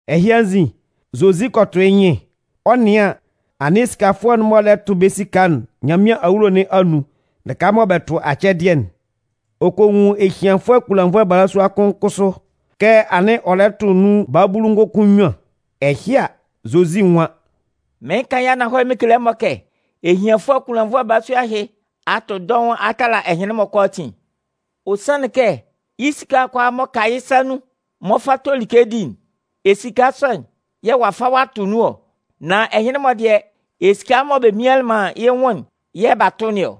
Ɛhɩ anzin, Zozi kɔ tʋ yɩ́ nyɩn, ɔ 'nɩan an, anɩn esikafʋɛ'n-mɔ lɛ tʋ bɛ́ esika'n Nyanmɩan awulo nɩn anun lɩka mɔ bɛ tʋ acɛdɩɛ'n. Ɔ kɔ nwun ehianfʋɛ kunlannvʋɛ balasua kʋn kʋsʋ kɛ anɩn ɔ lɛ tʋ nun babulu ngʋnkʋn nnyuan. Ɛhɩ a, Zozi nwan: “Mɩɩn kan yɩ́ ananhɔlɛ mɩn kele ɛmɔ kɛ, ehianfʋɛ kunlannvʋɛ balasua ɛhɩ a tʋ dɔʋn a tala ɛhɩnlɩn-mɔ kʋalaatin. Ɔ sanlɩn kɛ yɩ́ esika kʋalaa m'ɔ ka yɩ́ sa nun mɔ ɔ 'fa to like di'n, esika sɔ'n yɛ̂ ɔ'a fa ɔ'a tʋ nun ɔ. Nan ɛhɩnlɩn-mɔ dɩɛ, esika mɔ bɛ mmianlɩn man yɩ́ nwʋn'n yɛ̂ b'a tʋ yɩ́ nun ɔ.”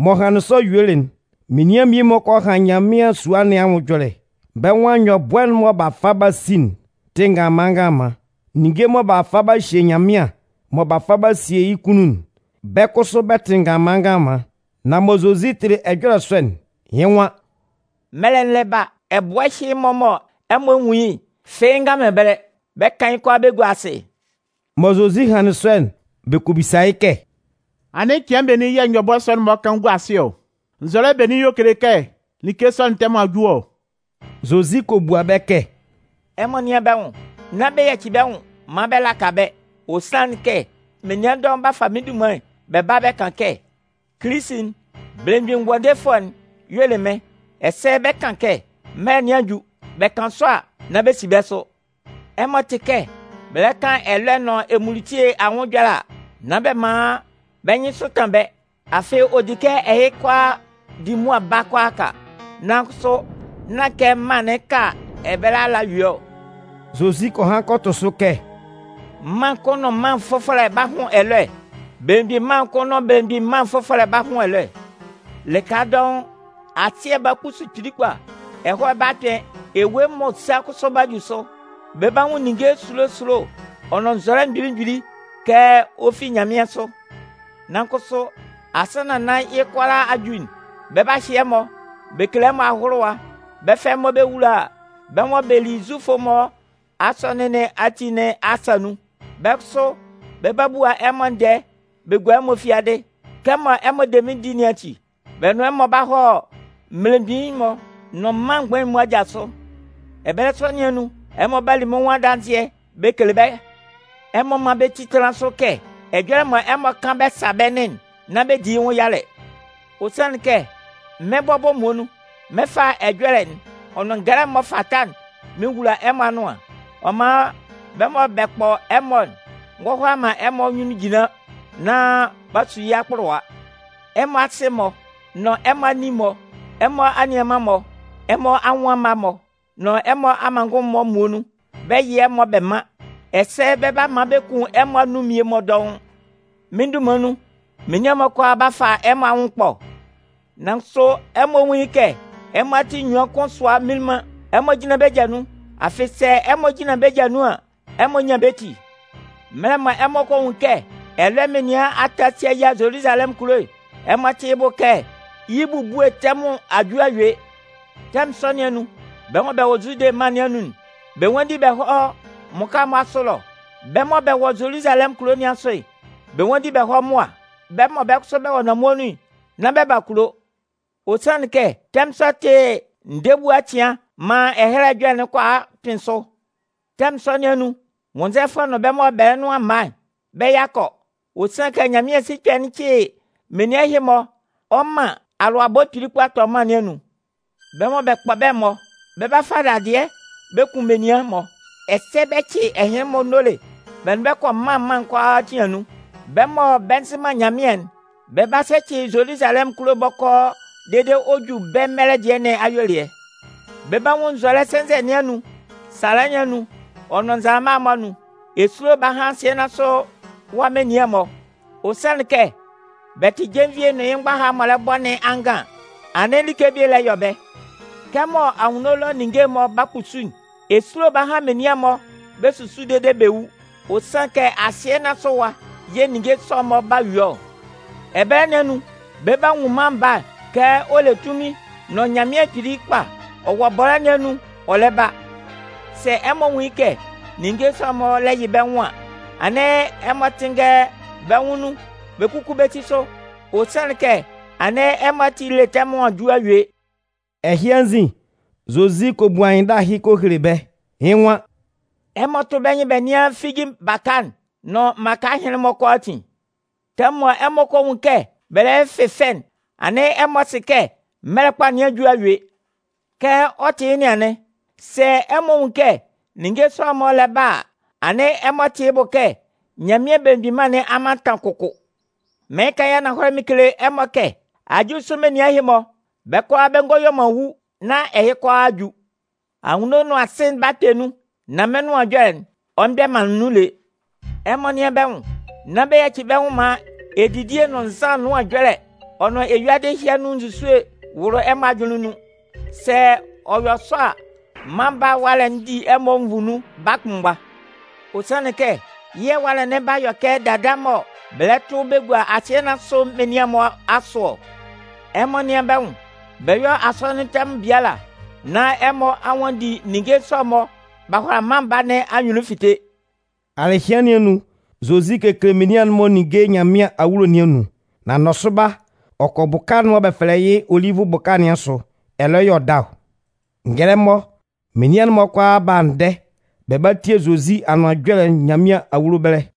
Mɔ hanlɩn sɔ yuelɩ'n, menian mmie-mɔ kɔ han Nyanmɩan sua nɩn anwʋn ɛjɔlɛ. Bɛ́ nwan nyɔbʋɛ'n mɔ b'a fa b'a si'n tɩ nganlanman nganlanman. Ninnge mɔ b'a fa b'a hye Nyanmɩan, mɔ b'a fa b'a sesie yɩ́ kunnun'n, bɛ́ kʋsʋ bɛ tɩ nganlanman nganlanman. Nan mɔ Zozi tɩlɩ ɛjɔlɛ sɔ'n, yɩ́ nwan: “Mɛlɛ'n lɛ ba, ɛbʋɛ ɛhɩ-mɔ mɔ ɛmɔ nwun yɩ́'n, fɩ́ɩ́ nga man ɛbɛlɛ. Bɛ 'kan yɩ́ kʋalaa bɛ gua asɩ.” Mɔ Zozi hanlɩn sɔ'n, bɛ kɔ bisa yɩ́ kɛ: “Anɩn cɩan benin yɛ̂ nyɔbʋɛ sɔ'n-mɔ 'kan gua asɩ ɔ? Nzɔlɛ benin yɛ̂ ɔ 'kele kɛ like sɔ'n tɛmʋn a ju ɔ?” Zozi kɔ bua bɛ́ kɛ: “Ɛmɔ nɩ́an bɛ́ nwʋn, nán bɛ yaci bɛ́ nwʋn maan bɛ laka bɛ́. Ɔ sanlɩn kɛ, menian dɔʋn 'ba fa mɩ́n dunman bɛ ba bɛ kan kɛ: ‘Kilisi'n, Belemgbin Ngʋandefʋɛ'n, y'ɔ le mɩ́n!’ ɛsɛ bɛ 'kan kɛ: ‘Mɛlɛ nɩn a ju!’ Bɛ kan sɔ a, nán bɛ si bɛ́ sʋ. Ɛmɔ tɩ kɛ bɛ lɛ kan ɛlɔɛ nʋn emunlutie anwʋn ɛjɔlɛ a, nán bɛ man bɛ́ nyɩnsʋ tan bɛ́. Afɩ ɔ di kɛ ɛhɩ kʋalaa di mʋa ba kʋalaaka. Nan kʋsʋ nán kɛ mân'n 'ka ɛbɛlɛ ala ɔ yue ɔ.” Zozi kɔ han kɔ tʋ sʋ kɛ: “Mân kʋn nʋn mân fʋfɔlɛ 'ba hʋn ɛlɔɛ. Belemgbin mân kʋn nʋn belemgbin mân fʋfɔlɛ 'ba hʋn ɛlɔɛ. Lɩka dɔʋn, asɩɛ'n 'ba kpusu kpili kpa, ɛhɔɛ 'ba kpɩn, ewue m'ɔ sa kʋsʋ 'ba ju sʋ. Bɛ 'ba nwun ninnge esulo esulo ɔ nʋn nzɔlɛ mgbili mgbili kɛ ɔ fi nyanmɩansʋ. “Nan kʋsʋ, asannan nán yɩ́ kʋalaa a ju'n, bɛ 'ba hyɩ ɛmɔ, bɛ 'kele ɛmɔ ahʋlʋwa. Bɛ 'fa ɛmɔ bɛ wula bɛ́ mɔ bɛ li Zufʋ'n-mɔ asɔnɩn nɩn ati nɩn asa nun. Bɛ́ kʋsʋ bɛ 'bua ɛmɔ ndɛɛ bɛ gua ɛmɔ fiadɩ. Kɛmɔ ɛmɔ de mɩ́n di nɩn ati, bɛ nʋn ɛmɔ 'ba hɔ mmelemgbin'n-mɔ nʋn mân mgbain'n-mɔ aja sʋ. Ɛbɛlɛ sɔ nɩn anun, ɛmɔ 'ba li mɩ́n nwʋn adanzɩɛ bɛ kele bɛ́. Ɛmɔ mán bɛ ti tánlan sʋ kɛ ɛjɔlɛ mɔ ɛmɔ 'kan bɛ sa bɛ́ nɩn'n, nán bɛ di yɩ́ nwʋn yalɛ. Ɔ sanlɩn kɛ, mɩ́n bɔbɔ muonun, mɩn 'fa ɛjɔlɛ'n ɔ nʋn ngɛlɛ'n m'ɔ fata'n mɩn wula ɛmɔ anʋan. Ɔ man bɛ́ mɔ bɛ kpɔ ɛmɔ'n ngɔ hʋala man bɛ́ nyunnun jinlan nán 'ba su yɩ́ akpʋlʋwa. Ɛmɔ asɩ-mɔ nʋn ɛmɔ anin-mɔ, ɛmɔ anianman-mɔ, ɛmɔ anwʋn amma-mɔ nʋn ɛmɔ amanngʋn-mɔ muonun, bɛ 'yɩ ɛmɔ bɛ man. Ɛsɛ bɛ 'ba man bɛ kun ɛmɔ anun mmie-mɔ dɔʋn. Mɩ́n dunman nun, menian'n-mɔ kʋalaa 'ba fa ɛmɔ anwʋn ɛkpɔ. Nan kʋsʋ ɛmɔ nwún yɩ́ kɛ ɛmɔ ati enyuan kʋn sʋa mminlin man. Ɛmɔ jínlan bɛ́ ja nun. Afɩ sɛ ɛmɔ jinlan bɛ́ ja nun an, ɛmɔ 'nyan bɛ́ ti. “Mɛlɛ mɔ ɛmɔ kɔ nwun kɛ ɛlɔɛ menian a ta a si a yia Zoluzalɛmʋn kulo'n, ɛmɔ tɩ́ yɩ́ bʋ kɛ yɩ́ ebubue tɛmʋn a ju a yue. Tɛmʋn sɔ nɩn anun, bɛ́ mɔ bɛ wɔ Zude mân nɩn anun'n, bɛ nwánndi bɛ hɔ́ mmʋka'n-mɔ asʋ ɛlɔ. Bɛ́ mɔ bɛ wɔ Zoluzalɛmʋn kulo nɩn asʋ'n, bɛ nwánndi bɛ hɔ́ mʋa. Bɛ́ mɔ bɛ́ kʋsʋ bɛ wɔ nanmue nun'n, nán bɛ ba kulo. Ɔ sanlɩn kɛ, tɛmʋn sɔ'n tɩ ndɛɛ ebua cɩan maan Ɛhɛlɛ Ɛjɔlɛ'n kʋalaa kpɩn sʋ. Tɛmʋn sɔ nɩn anun, nwʋnnzɛfʋɛ nʋn bɛ́ mɔ bɛ nʋan mma, bɛ́ yakɔ! Ɔ sanlɩn kɛ Nyanmɩan sikpɛ'n 'cɩ menian ɛhɩ-mɔ ɔ man alʋabɔ kpili kpa tɔ mân nɩn anun. Bɛ́ mɔ bɛ kpɔ bɛ́'n-mɔ 'ba fa dadɩɛ bɛ kun mmie-mɔ, ɛsɛ bɛ cɩ ɛhɩnlɩn-mɔ nóle bɛ nʋn bɛ́ kɔ mân mân'n kʋalaatin anun. Bɛ́ mɔ bɛ nzɩ man Nyanmɩan'n, bɛ 'ba sɛcɩ Zoluzalɛmʋn kulo'n bɔkɔɔ dede ɔ ju bɛ́ mɛlɛ dɩɛ nɩn ayuelɩɛ. “Bɛ 'ba nwun nzɔlɛ sɛnzɛ nɩn anun, sala nɩn anun ɔ nʋn nzalama'n-mɔ anun. Esulo 'ba han asɩɛ nɩn asʋ ɛwa menian'n-mɔ. Ɔ sanlɩn kɛ bɛ 'tɩ jenvie'n nʋn yɩ́ mgbaha'n m'ɔ lɛ bɔ nɩn angan an, anɩn like bie lɛ yɔ bɛ́. Kɛmɔ anwunno ɛlɔ ninnge'n-mɔ 'ba kpusu'n, esulo 'ba han menian'n-mɔ bɛ susu dede bɛ wu. Ɔ sanlɩn kɛ asɩɛ nɩn asʋ ɛwa yɛ̂ ninnge sɔ'n-mɔ 'ba yue ɔ. Ɛbɛlɛ nɩn anun, bɛ 'ba nwun Mân Baa'n kɛ ɔ le tunmin nʋn anunminnyanmʋn kpili kpa, ɔ wɔ bɔlɛ́ nɩn anun ɔ lɛ ba. Sɛ ɛmɔ nwun yɩ́ kɛ ninnge sɔ'n-mɔ lɛ yɩ bɛ́ nwʋn an, anɩn ɛmɔ tɩ́nngɛ bɛ́ nwʋn nun bɛ kúku bɛ́ ti sʋ. Ɔ sanlɩn kɛ anɩn ɛmɔ ati ele tɛmʋn a ju a yue.” Ɛhɩ anzin, Zozi kɔ bu anyɩnndala ɛhɩ kɔ hele bɛ́, yɩ́ nwan: “Ɛmɔ tʋ́ bɛ́ nyɩn bɛ nɩ́an figi baka'n nʋn mmaka ɛhɩnlɩn-mɔ kʋalaatin. Tɛmʋn mɔ ɛmɔ kɔ nwun kɛ bɛ lɛ fɩfɛ'n, anɩn ɛmɔ sɩ kɛ mɛlɛ kpa nɩn a ju a yue. Kɛ ɔ tɩ yɩ́ nɩn anɩn, sɛ ɛmɔ nwun kɛ ninnge sɔ'n-mɔ lɛ ba a, anɩn ɛmɔ tɩ́ yɩ́ bʋ kɛ Nyanmɩan Belemgbin Mân nɩn a mantan kʋkʋ. “Mɩɩn kan yɩ́ ananhɔlɛ mɩn kele ɛmɔ kɛ ajulisʋ menian ɛhɩ-mɔ, bɛ́ kʋalaa bɛ ngɔ yue man wu nán ɛhɩ kʋalaa a ju. Anwunno nʋn asɩ'n 'ba kpɛ nun, nan mɩ́n nʋan ɛjɔlɛ'n, ɔ mgbɛ man nun lé. “Ɛmɔ nɩ́an bɛ́ nwʋn! Nán bɛ yaci bɛ́ nwʋn maan edidie nʋn nzan ɛnʋan ɛjɔlɛ ɔ nʋn eyuadɩ ɛhɩ anun nzusue wʋlʋ ɛmɔ ajʋnlɩn nun. Sɛ ɔ yɔ sɔ a, Mân Baa nɩn ɛwalɛ'n 'di ɛmɔ nvu nun baa kʋnmgba. Ɔ sanlɩn kɛ, yɩ́ ɛwalɛ'n 'ba yɔ kɛ dada mɔ bɛ lɛ tʋ bɛ gua asɩɛ nɩn asʋ menian'n-mɔ asʋ ɔ. Ɛmɔ nɩ́an bɛ́ nwʋn, bɛ yɔ́ asɔnɩn tɛmʋn biala nán ɛmɔ a nwanndi ninnge sɔ'n-mɔ b'a hʋala Mân Baa nɩn anyunnun fite.” Alɩhɩan nɩn anun, Zozi kekele menian'n-mɔ ninnge Nyanmɩan awulo nɩn anun. Nan nɔsʋba, ɔ kɔ bʋka'n mɔ bɛ fɛlɛ yɩ́ Olivʋ bʋka nɩn asʋ. Ɛlɔ y'ɔ da ɔ. Ngɛlɛmɔ, menian'n-mɔ kʋalaa ba ndɛ bɛ ba tie Zozi Anʋan Ɛjɔlɛ'n Nyanmɩan awulo ɛbɛlɛ.